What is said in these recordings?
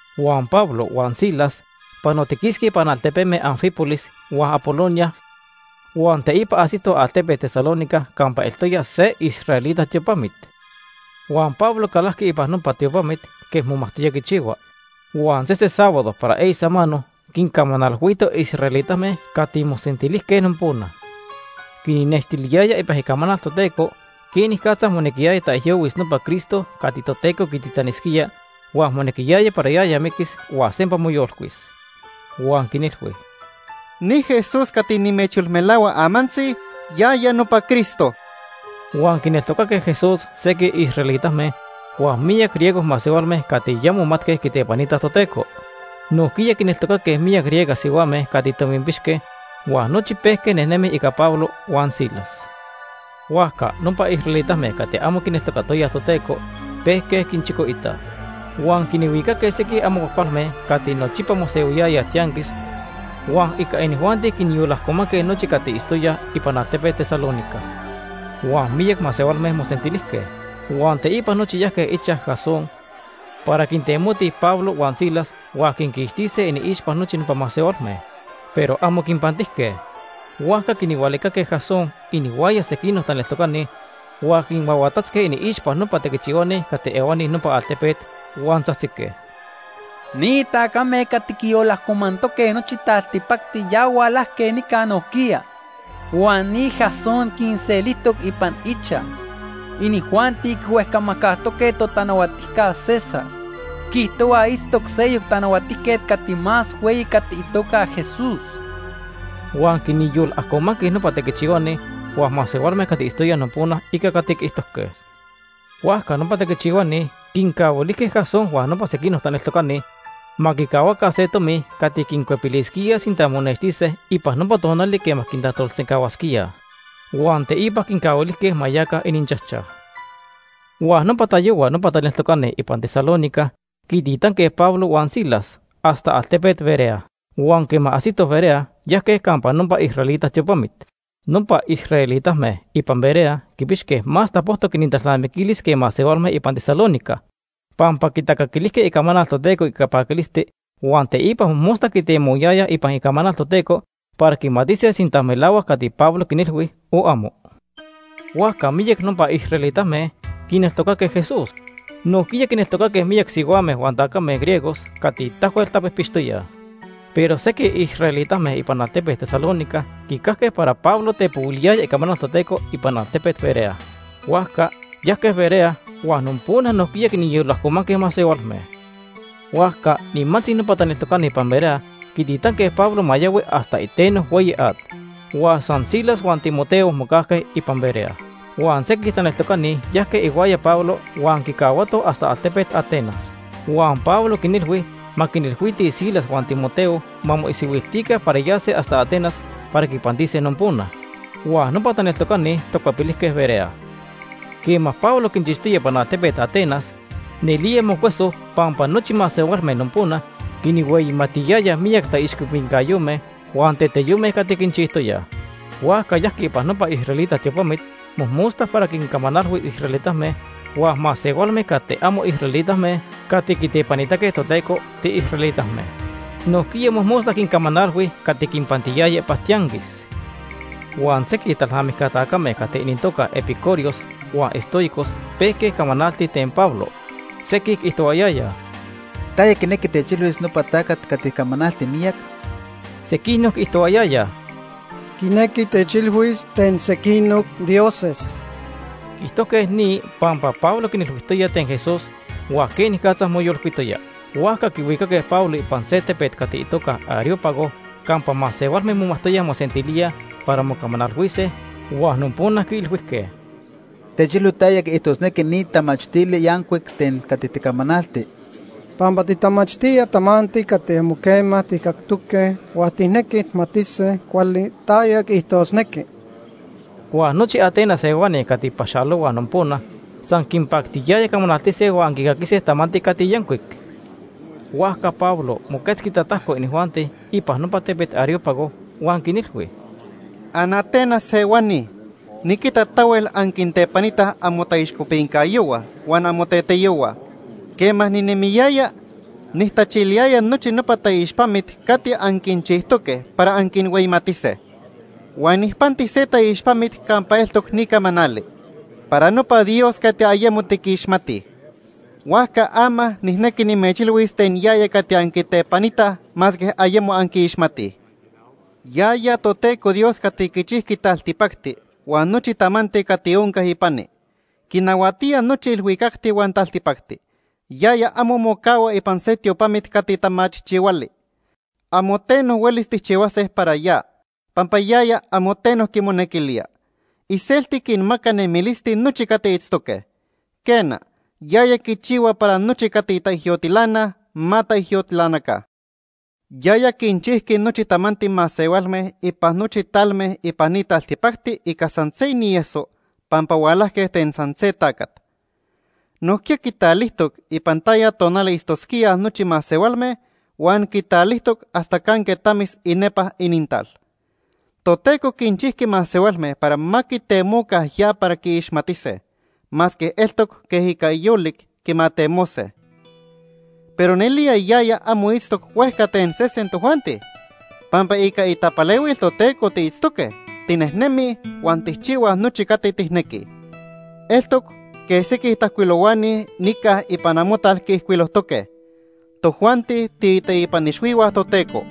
Huan Pablo huan Silas panotiquisque ipan altepeme Anfípolis huan Apolonia huan teipa ajsitoj altepet Tesalónica campa eltoya se israelita tiopamit. Huan Pablo calajqui ipan nopa tiopamit quej momajtoya quichihua, huan sese sábado para eyi samano quincamanalhuito israelitame cati mosentilijque nopona. Quinnextiliyaya ipan Icamanal Toteco quenicatza monequiyaya taijyohuis nopa Cristo cati Toteco quititanisquía huan monequiyaya para yaya miquis huan sempa moyolcuis. Huan quinilhui: ―Ni Jesús cati nimechyolmelahua amantzi, yaya nopa Cristo. Huan quineltocaque Jesús sequij israelitame huan miyac griego masehualme cati ya momatque quitepanitaj Toteco. Nojquiya quineltocaque miyac griega sihuame cati tominpixque huan nochi pejque nejnemij ica Pablo huan Silas. Huajca nopa israelitame cati amo quineltocatoyaj Toteco pejque quinchicoitaj. Huan quinhuicaque sequij amo cuajcualme cati nochipa mosehuiyayaj tianquis, huan ica inijuanti quinyolajcomanque nochi cati itztoyaj ipan altepet Tesalónica. Huan miyac masehualme mosentilijque. Huan teipa nochi yajque ichaj Jasón para quintemotij Pablo huan Silas huan quinquixtise iniixpa nochi nopa masehualme. Pero amo quinpantijque. Huajca quinhualicaque Jasón inihuaya sequinoc taneltocani, huan quinhuahuatatzque iniixpa nopa tequichihuani cati ehuani nopa altepet huan tzajtzique: ―Ni tacame cati quiyolajcomantoque nochi taltipacti ya hualajque nica nojquiya. Huan ni Jasón quinselijtoc ipan ichaj. Inijuanti quihuejcamajcajtoque totanahuatijca César. Quiijtohuaj itztoc seyoc tanahuatijquet cati más hueyi cati itoca Jesús. Huan quinyolajcomanque nopa tequichihuani huan masehualme cati itztoyaj nopona ica cati quiijtojque. Huajca nopa tequichihuani quincahuilijque Jasón huan nopa sequinoc taneltocani ma quicahuaca se tomi cati quincuepilisquíaj sinta monextise ipan nopa tonali quema quintajtolsencahuasquíaj. Huan teipa quincahuilijque ma yaca ininchajchaj. Huan nopa tayohua nopa taneltocani ipan Tesalónica quintitanque Pablo huan Silas hasta altepet Berea, huan quema ajsitoj Berea, yajque campa nopa israelita tiopamit. Nopa israelitame ipan Berea quipixque más tapojtoc inintalnamiquilis que masehualme ipan Tesalónica, pampa quitacaquilijque icamanal Toteco ica paquilisti huan teipa mojmosta quitemohuayayaj ipan Icamanal Toteco para quimatise sinta melahuac cati Pablo quinilhui o amo. Huajca miyac nopa israelitame quineltocaque Jesús. Nojquiya quineltocaque miyac sihuame huan tacame griegos cati tahuel tapijpixtoyaj. Pero sequij israelitame ipan altepet Tesalónica quicajque para Pablo tepohuiliyaya icamanal Toteco ipan altepet Berea. Huajca yajque Berea huan nopona nojquiya quinyolajcomanque masehualme. Huajca nimantzi nopa taneltocani ipan Berea quititanque Pablo ma yahui hasta iteno hueyi at, huan san Silas huan Timoteo mocajque ipan Berea. Huan sequij taneltocani yajque ihuaya Pablo huan quicahuatoj hasta altepet Atenas. Huan Pablo quinilhui ma quinilhuitij Silas huan Timoteo ma moisihuiltica para yase hasta Atenas para quipantise nopona. Huan nopa taneltocani tacuepilijque Berea. Quema Pablo quinchixtoya ipan altepet Atenas, nelía mocueso pampa nochi masehualme nopona quinhueyimatiyayaj miyac taixcopincayome huan teteyome cati quinchijtoyaj. Huajca yajqui ipan nopa israelita tiopamit mojmosta para quincamanalhuis israelitame huan masehualme cati amo israelitame cati quitepanitaque Toteco tiisraelitame. Nojquiya mojmosta quincamanalhui cati quinpantiyaya ipan tianquis. Huan sequij talnamijca tacame cati inintoca epicúreos huan estoicos pejque camanaltij ten Pablo. Sequij quiijtohuayayaj: ―¿Taya quinequi techilhuis nopa tacat cati camanalti miyac? Sequinoc quiijtohuayayaj: ―Quinequi techilhuis ten sequinoc dioses. Quiijtojque ni pampa Pablo quinilhuijtoya ten Jesús huan quenicatza moyolcuitoya. Huajca quihuicaque Pablo ipan se tepet cati itoca Areópago campa masehualme momajtoyaj mosentilíaj para mocamanalhuise huan nopona quiilhuijque: ―Techilhui taya quiijtosnequi ni tamachtili yancuic ten cati ticamanalti, pampa titamachtía tamanti cati amo quema tijcactoque huan tijnequij tijmatise cuali taya quiijtosnequi. Huan nochi Atenas ehuani huan cati paxalohuaj nopona san quinpactiyaya camanaltise huan quicaquise tamanti cati yancuic. Huajca Pablo moquetzqui tatajco inijuanti ipan nopa tepet Areópago huan quinilhui: “AnAtenas ehuani, niquita tahuel anquintepanitaj amotaixcopincayohua huan amoteteyohua. Quema ninemiyaya, nijtachiliyaya nochi nopa taixpamit cati anquinchijtoque para anquinhueyimatise. Huan nijpanti se taixpamit campa eltoc ni camanali: ‘Para nopa dios cati ayemo tiquixmatij.’ Huajca ama nijnequi nimechilhuis ten yaya cati anquitepanitaj masque ayemo anquiixmatij. “Yaya Toteco Dios cati quichijqui taltipacti huan nochi tamanti cati onca ipani. Quinahuatía nochi ilhuicacti huan taltipacti. Yaya amo mocahua ipan se tiopamit cati tamachijchihuali. Amo teno huelis tijchihuase para ya, pampa yaya amo teno quimonequilía. Iselti quinmaca nemilisti nochi cati itztoque. Quena, yaya quichihua para nochi cati titaijyotilanaj ma titaijyotilanaca. “Yaya quinchijqui nochi tamanti masehualme ipan nochi talme ipan ni taltipacti ica san se inieso pampa hualajque ten san se tacat. Nojquiya quitalijtoc ipan taya tonali itztosquíaj nochi masehualme huan quitalijtoc hasta canque tamis inepa inintal. Toteco quinchijqui masehualme para ma quitemoca ya para quiixmatise, masque eltoc quej ica yolic quimatemose. Pero nelía yaya amo itztoc huejca ten sesen tojuanti. Pampa ica itapalehuil Toteco tiitztoque, tinejnemij huan tijchihuaj nochi cati tijnequij. Eltoc quej sequij tajcuilohuani nica ipan amotal quiijcuilojtoque: ‘Tojuanti tiiteipan ixhuihua Toteco.’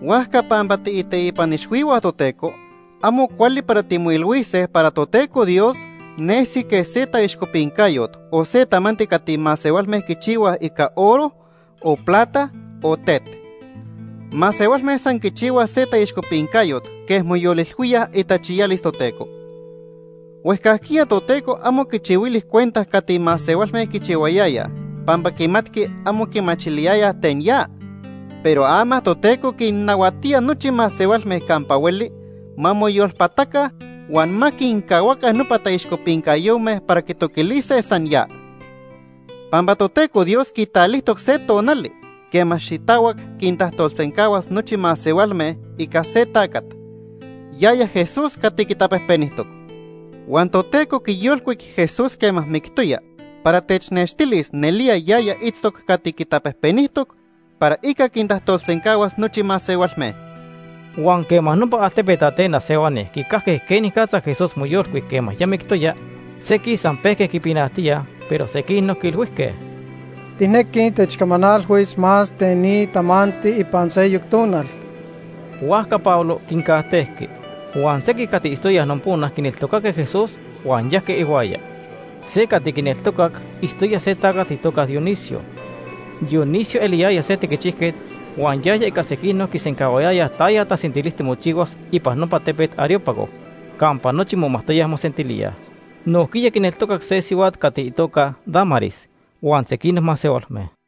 Huajca pampa tiiteipan ixhuihua Toteco, amo cuali para timoilhuise para Toteco Dios nesi quej se taixcopincayot o se tamanti cati masehualme quichihuaj ica oro, o plata o tet. Masehualme san quichihuaj se taixcopincayot quej moyolilhuíaj itachiyalis Toteco. Huejcajquiya Toteco amo quichihuili cuenta cati masehualme quichihuayayaj pampa quimatqui amo quimachiliyayaj ten ya. Pero ama Toteco quinnahuatía nochi masehualme campa hueli ma moyolpataca huan ma quincahuaca nopa taixcopincayome para quitoquilise san ya. Pampa Toteco Dios quitalijtoc se tonali quema xitahuac quintajtolsencahuas nochi masehualme ica se tacat, yaya Jesús cati quitapejpenijtoc. Huan Toteco quiyolcuic Jesús quema mictoya para technextilis nelía yaya itztoc cati quitapejpenijtoc para ica quintajtolsencahuas nochi masehualme.” Huan quema nopa altepet Atenas ehuani quicajque quenicatza Jesús moyolcuic quema ya mictoya, sequij san pejque quipinajtíaj, pero sequinoc quiilhuijque: ―Tijnequij techcamanalhuis más ten ni tamanti ipan seyoc tonal. Huajca Pablo quincajtejqui. Huan sequij cati itztoyaj nopona quineltocaque Jesús, huan yajque ihuaya. Se cati quineltocac itztoya se tacat itoca Dionisio. Dionisio eliyaya se tequichijquet huan yaya ica sequinoc quisencahuayaya taya tasentilisti mochihuas ipan nopa tepet Areópago campa nochi momajtoyaj mosentilíaj. Nojquiya quineltocac se sihuat cati itoca Dámaris huan sequinoc masehualme.